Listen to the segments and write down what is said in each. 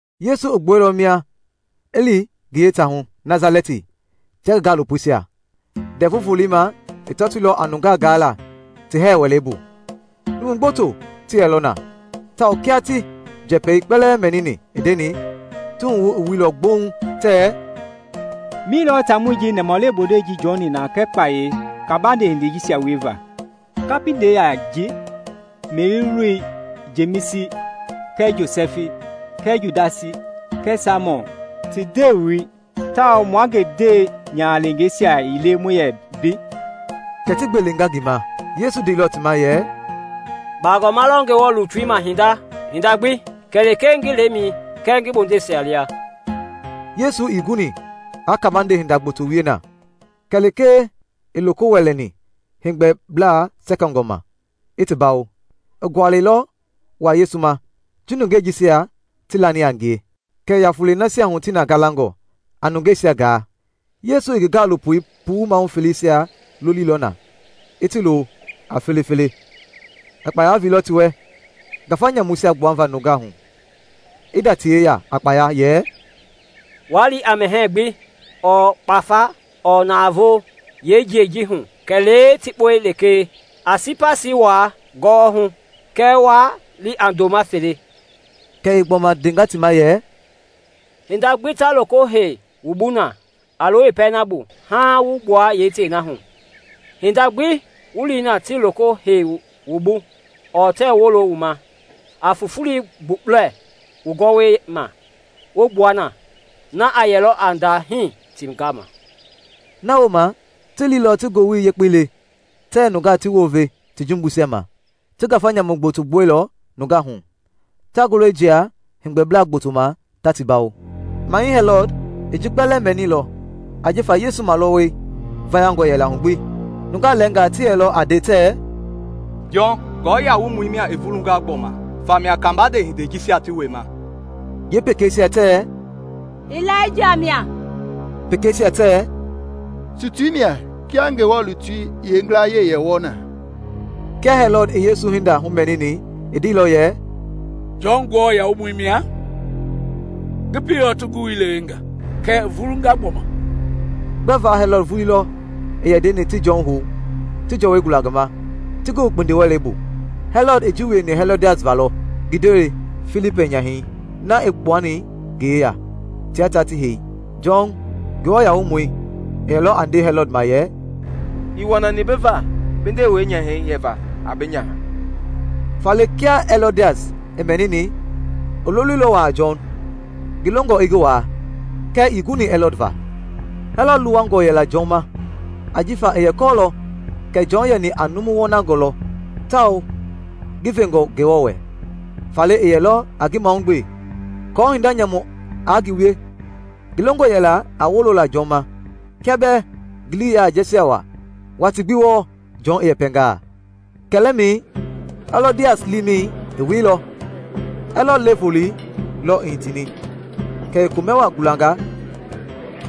Yesu i gbuailɔ mia i li ngi yeetaahu, Nasalɛti, tia ngi gaalopoisia. Ndɛvu Volei ma i tɔtoilɔ a nungaa gaala ti hɛɛ wɛlei bu. Numu gboto ti yɛlɔ na, tawao kia ti njɛpɛi kpɛlɛɛ mɛnini i ndeni, ti wuhu i wuilɔ gbouŋ tɛɛ, “Mi lɔ taamɔi ji i nɛmahulewe bondei ji jɔni na kɛɛ kpayei kabande hindeisia wieva? Kapindɛi ya ji, Meri loi, Jemisi kɛɛ Josɛfi kɛɛ Judasi kɛɛ Saimɔn ti ndewei, tawao mua ngi ndewe-nyahaleengeisia ii le mua yɛ mbei?” Kɛ ti gbelenga ngi ma. Yesu ndeilɔ ti ma yɛ, “Bagɔma lɔ Ngewɔ lutui ma hinda gbi kɛlee ngi lemɛi kɛɛ ngi bondeisia lia.” Yesu ii guni aa kabande hinda gboto wie na, kɛlee lekee i loko wɛlɛni heegbɛbla sɛkɛngɔ ma, i ti bawo. I gualɛilɔ wa Yesu ma ji nungei jisia tii lani a ngie. Kɛ i ya fulei nasia hu ti na galangɔ, a nungeisia gaa. Yesu i ngi gaalopo puu mahu feleisia lolilɔ na i ti lo a felefele. I kpaya veilɔ ti wɛ ngafa nyamuisia gbuava nungaa hu, i nda ti yeya a kpaya yɛ, “Waa li a mɛhɛɛ gbi ɔɔ kpafa ɔɔ navoo yeejiɛi ji hu kɛlee tikpɔi lekee. A sipasii wua gɔwɔhu kɛɛ waa li a ndoma fele.” Kɛ i gbɔma ndenga ti ma yɛ, “Hinda gbi ta loko hei wu bu na, a lo yeepɛlei na bu haaŋ wu gbua yeetei na hu. Hinda gbi wu li na tii loko heilɔ wu bu ɔɔ tɛɛ wolo wu ma, a fufulei gbukpulɛ wu gɔwɔi ma, wu gbua na. Na a yɛlɔ a ndahii ti gama!” Na wooma ti liilɔ ti ngowili yekpei le tɛɛ nungaa ti wounve ti jumbuisia ma. Ti ngafa nyamu gboto gbuailɔ nungaa hu, ta ngulɔi jia heegbɛbla gboto ma ta ti bawo. Mahɛi Hɛlɔd i ji kpɛlɛɛ mɛnilɔ ajifa Yesu malɔwɔi vayangɔ yɛla hu gbi. Nungaa lɛɛngaa ti yɛlɔ a nde tɛɛ, “Jɔn Nguamɔi mia i vulunga gbɔma! Famia kabande hindei jisia ti wiema.” Yeepekeisia tɛɛ, “Ilaija mia.” Pekeisia tɛɛ, “Tutui mia kia Ngewɔ lutui yeengilaye yɛ wɔɔ na.” Kia Hɛlɔd i Yesu hinda humɛnini, i ndeilɔ yɛ, “Jɔn, Nguamɔi, mia; ngi pieilɔ ti ngi wui lewe nga, kɛɛ i vulunga gbɔma.” Gbɛva Hɛlɔd vulii lɔ i yɛ ndeni ti Jɔn hou, ti jɔwɔi gula ngi ma, ti ngi wu kpindiwɛlei bu. Hɛlɔd i ji wieni Hɛlɔdias va lɔ, ngi ndewei Filipi nyahɛi na i kpuani ngi yeya, tia ta ti hei. Jɔn Nguamɔi, i yɛlɔ a nde Hɛlɔd ma yɛ, “Ii wɔnani bi va bi ndewei nyahɛi yɛva a bi nyaha!” Faale kia Hɛlɔdias i mɛnini, i loloilɔ wa a Jɔn, ngi longɔ i ngi waa, kɛɛ ii guni Hɛlɔd va. Hɛlɔd luwangɔ yɛla Jɔn ma ajifa i yɛ kɔɔlɔ kɛ Jɔn yɛni a numu wɔnangɔ lɔ tawao ngi vengɔ Ngewɔ wɛ, faale i yɛlɔ a ngi mahugbe aako hinda nyamu aa ngi wie. Ngi longɔ yɛla a wolola Jɔn ma kia bɛɛ ngi lii i yɛ jɛɛjialɔ wa watii gbi wɔɔ Jɔn i yɛpɛngaa. Kɛlɛmɛi Hɛlɔdias liimɛi i wieilɔ. Hɛlɔd le-volei lɔ i hitini kɛ i komɛ wa gulanga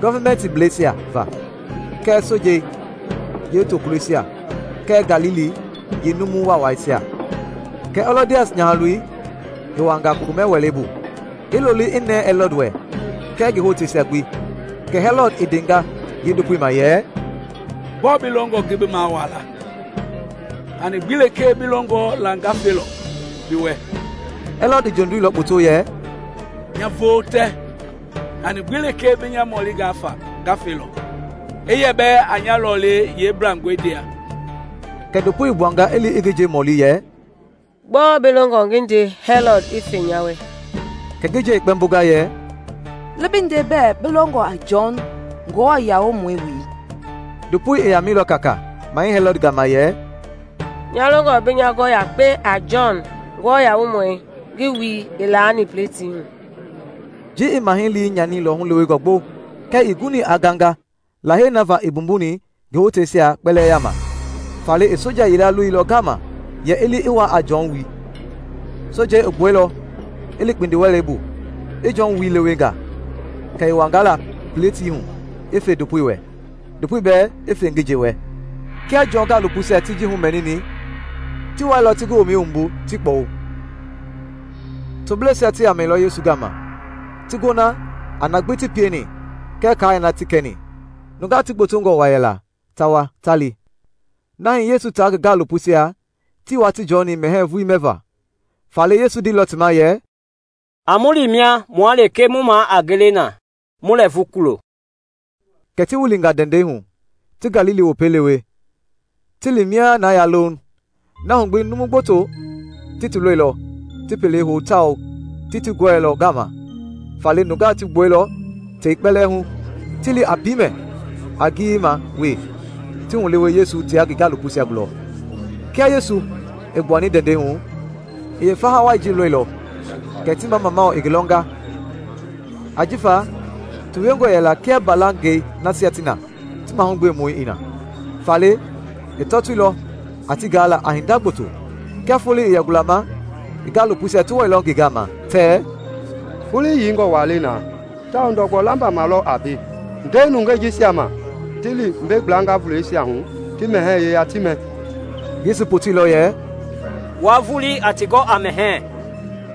gɔvimɛntiblɛisia va kɛɛ sojei yeetokulɔisia kɛɛ Galili yeenumu waawaisia. Kɛ Hɛlɔdias nyahaloi i wuanga komɛ-wɛlei bu, i looli i nɛɛ Hɛlɔd wɛ kɛɛ ngi hoteisia gbi. Kɛ Hɛlɔd i ndenga yeendopoi ma yɛ, “Gbɔɔ bi longɔ ngi bi mawaa la? Hani gbi lekee bi longɔ la nga felɔ bi wɛ.” Hɛlɔd i jondiilɔ kpoto yɛ, “Nya vootɛ, hani gbi lekee bi nya mɔlinga fa, nga felɔ, i yɛ bɛɛ a nya lɔlei yeemblangɔ ndia!” Kɛ ndopoi i gbuanga i li i ngi nje mɔli yɛ, “Gbɔɔ bi longɔ ngi nde Hɛlɔd i fe nya wɛ?” Kɛ ngi nje i kpɛmbonga yɛ, “Li bi nde bɛɛ bi longɔ a Jɔn, Nguamɔi, wui.” Ndopoi i yamɛilɔ kaakaa Mahɛi Hɛlɔd gama yɛ, “Nya longɔ bi nya gɔ yakpe a Jɔn, Nguamɔi, ngi wui i laani pletii hu!” Ji i Mahɛi lii nyanilɔ hulewengɔ gbo kɛɛ ii guni aa ganga lahei na va i mbumbuni ngi hotangɛisia kpɛlɛɛ yaama. Faale i soja yila loilɔ ngama yɛ i li i wa a Jɔn wui. Sojei i gbuɛilɔ, i li kpindiwɛlei bu, i Jɔn wui lewe nga; kɛ i wanga la pletii hu i fe ndopoi wɛ, ndopoi bɛɛ i fe ngi nje wɛ. Kia Jɔn gaalopoisia ti ji humɛnini, ti wailɔ ti ngi womɛi wumbu, ti kpɔwu. Tobleisia ti yamailɔ Yesu gama, ti gona a na gbi ti pieni kɛɛ kai na ti kɛni. Nungaa ti gbotongɔ wa yɛla, ta wa, ta li, na hii Yesu taa ngi gaalopoisia tii watii jɔni mɛhɛɛ vulii mɛva. Faale Yesu i ndeilɔ ti ma yɛ, “A mu li mia mua lekee mu ma a gele na, mu lɛɛvu kulo.” Kɛ ti wilinga ndɛndɛi hu ti Galili Wopei lewe, ti li mia na ya louŋ. Na hu gbi numu gboto ti ti lɔilɔ ti pelei hou tawao ti ti gɔɛilɔ ngama, faale nungaa ti gbuɛilɔ tei kpɛlɛɛ hu, ti li a piimɛ a ngiyei ma wee ti hulewe Yesu tia ngi gaalopoisia gulɔ. Kia Yesu i gbuani ndɛndɛi hu, i yeefaha wai ji lɔilɔ, kɛ ti mamamau i ngi lɔnga, ajifa ti wiengɔ yɛla kia mbalangɛi nasia ti na ti mahugbemɔ ii na. Faale i tɔtoilɔ a ti gaala a hinda gboto. Kia foloi i yɛ gulama, ngi gaalopoisia ti wailɔ ngi gama tɛɛ, “Foloi yeingɔ wa le na tawao ndɔgbɔ lamba ma lɔ a mbei. Nde nungei jisia ma ti li mbei gbla vulɛisia hu ti mɛhɛɛ yeya ti mɛ.” Yesu i poteilɔ yɛ, “Wua vulii a ti gɔ a mɛhɛɛ.”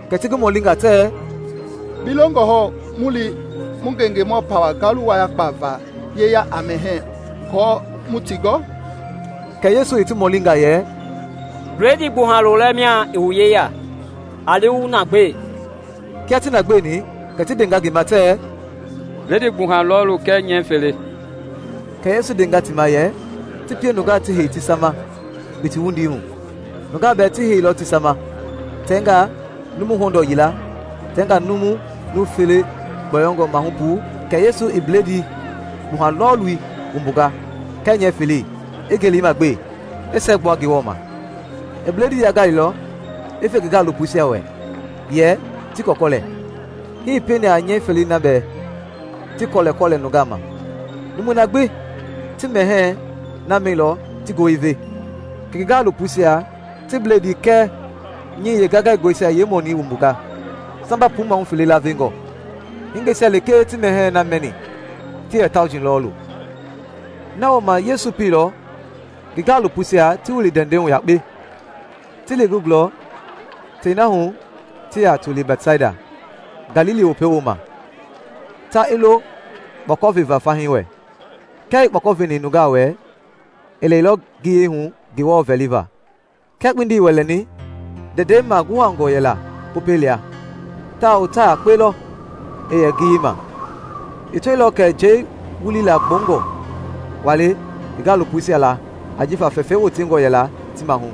Kɛ ti ngi mɔlinga tɛɛ, “Bi longɔ hɔɔ mu li mu ngengemɔ pawɛi ngalu wayakpa va yeya a mɛhɛɛ aako mu ti gɔ?” Kɛ Yesu i ti mɔlinga yɛ, “Bledii gbuha lolɛ mia i wu yeya? A li wu na gbe.” Kia ti na gbeeni kɛ ti ndenga ngi ma tɛɛ, “Bledii gbuha lɔɔlu kɛɛ nyɛɛ fele.” Kɛ Yesu i ndenga ti ma yɛ ti pie nungaa gbi ti hei tiwa ma kpiti wundii hu. Nungaa bɛɛ ti heilɔ tiwa ma, tɛngaa numu hɔndɔɔ yila, tɛngaa numu nuu fele gbɔyɔngɔ mahu puu. Kɛ Yesu i bledii gbuha lɔɔlui wumbunga kɛɛ nyɛɛ felei, i ngelema gbe, i siɛgbua Ngewɔ ma. I bledii yaingailɔ, i fe ngi gaalopoisia wɛ yɛ ti kɔlɛkɔlɛ. Hii i pieni a nyɛi felei na bɛɛ, ti kɔlɛkɔlɛ nungaa ma. Numui na gbi ti mɛhɛɛi na mɛilɔ ti goo i ve. Kɛ ngi gaalopoisia ti bledii kɛɛ nyɛi yeengaingaingɔi yeemɔnii wumbunga, i samba puu mahu fele laavengɔ. Hingeisia lekee ti mɛhɛɛi na mɛni ti yɛ tauji lɔɔlu. Na wooma Yesu i pieilɔ ngi gaalopoisia ti wili ndɛndɛi hu yakpe, ti li ngi gulɔ tei na hu ti yɛ toli a Bɛtsaida, Galili Wopei wooma, ta i lo kpɔkɔ veva fahii wɛ. Kia i kpɔkɔ veni nungaa wɛ, i lɛilɔ ngiyei hu Ngewɔ vɛliva. Kia kpindi i wɛlɛni, ndɛndɛi maguhangɔ yɛla Popɛi lia, tawao ta yakpe lɔ i yɛ ngiyei ma. I tɔilɔ kɛ njɛi wulilaa gbɔungɔ wa le ngi gaalopoisia la ajifa fɛfɛi wotengɔ yɛla ti mahu.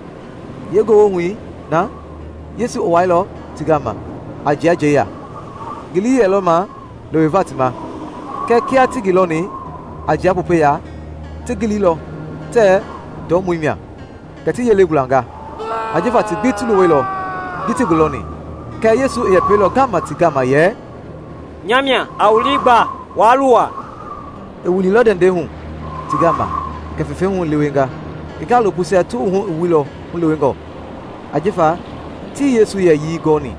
Yeengewohui na, Yesu i wailɔ ti gama a jia njɛi ya. Ngi lii yɛlɔ ma leweva ti ma. Kɛɛ kia ti ngi lɔni a jia Popɛi ya, ti giliilɔ tɛɛ ndɔumɔi mia, kɛ ti yelei gulanga; ajifa ti gbi ti luwɛilɔ ji ti ngi lɔni. Kɛɛ Yesu i yɛpɛilɔ ngama ti gama yɛ, “Nya mia! A wu lii gba. Waa luwa.” I wililɔ ndɛndɛi hu ti gama kɛ fɛfɛi hu i lewenga. Ngi gaalopoisia ti wuhu i wuilɔ hulewengɔ, ajifa tii Yesu yɛyii gɔni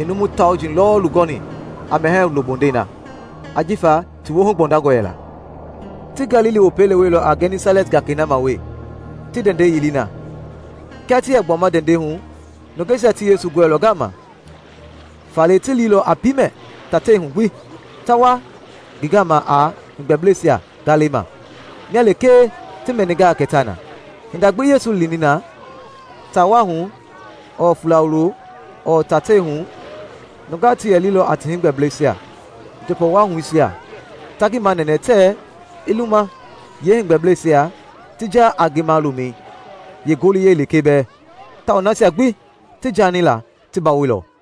i numu tauji lɔɔlu gɔni a mɛhɛɛ wulo bondei na, ajifa ti woohu gbɔndangɔ yɛla. Ti Galili Wopei leweilɔ a Gɛnisalɛt gakei ma wee, ti ndɛndɛi yili na. Kia ti yɛ gbuama ndɛndɛi hu, nungeisia ti Yesu gɔɛilɔ ngama. Faale ti liilɔ a piimɛ tatei na hu gbi, ta wa ngi gama a heegbɛbleisia ngalɛisia ma, mia lekee ti mɛningaa kɛ ta na. Hinda gbi Yesu i lini na, taa wa hu ɔɔ fuula wulo ɔɔ tateisia hu nungaa ti yɛ lilɔ a ti heegbɛbleisia njɔpɔwahuisia, ta ngi manɛnɛ tɛɛ i luma yeeheegbɛbleisia ti ja a ngi malomɛi yeengoliyɛi lekee bɛɛ. Tawao nasia gbi ti jaani la ti bawoilɔ.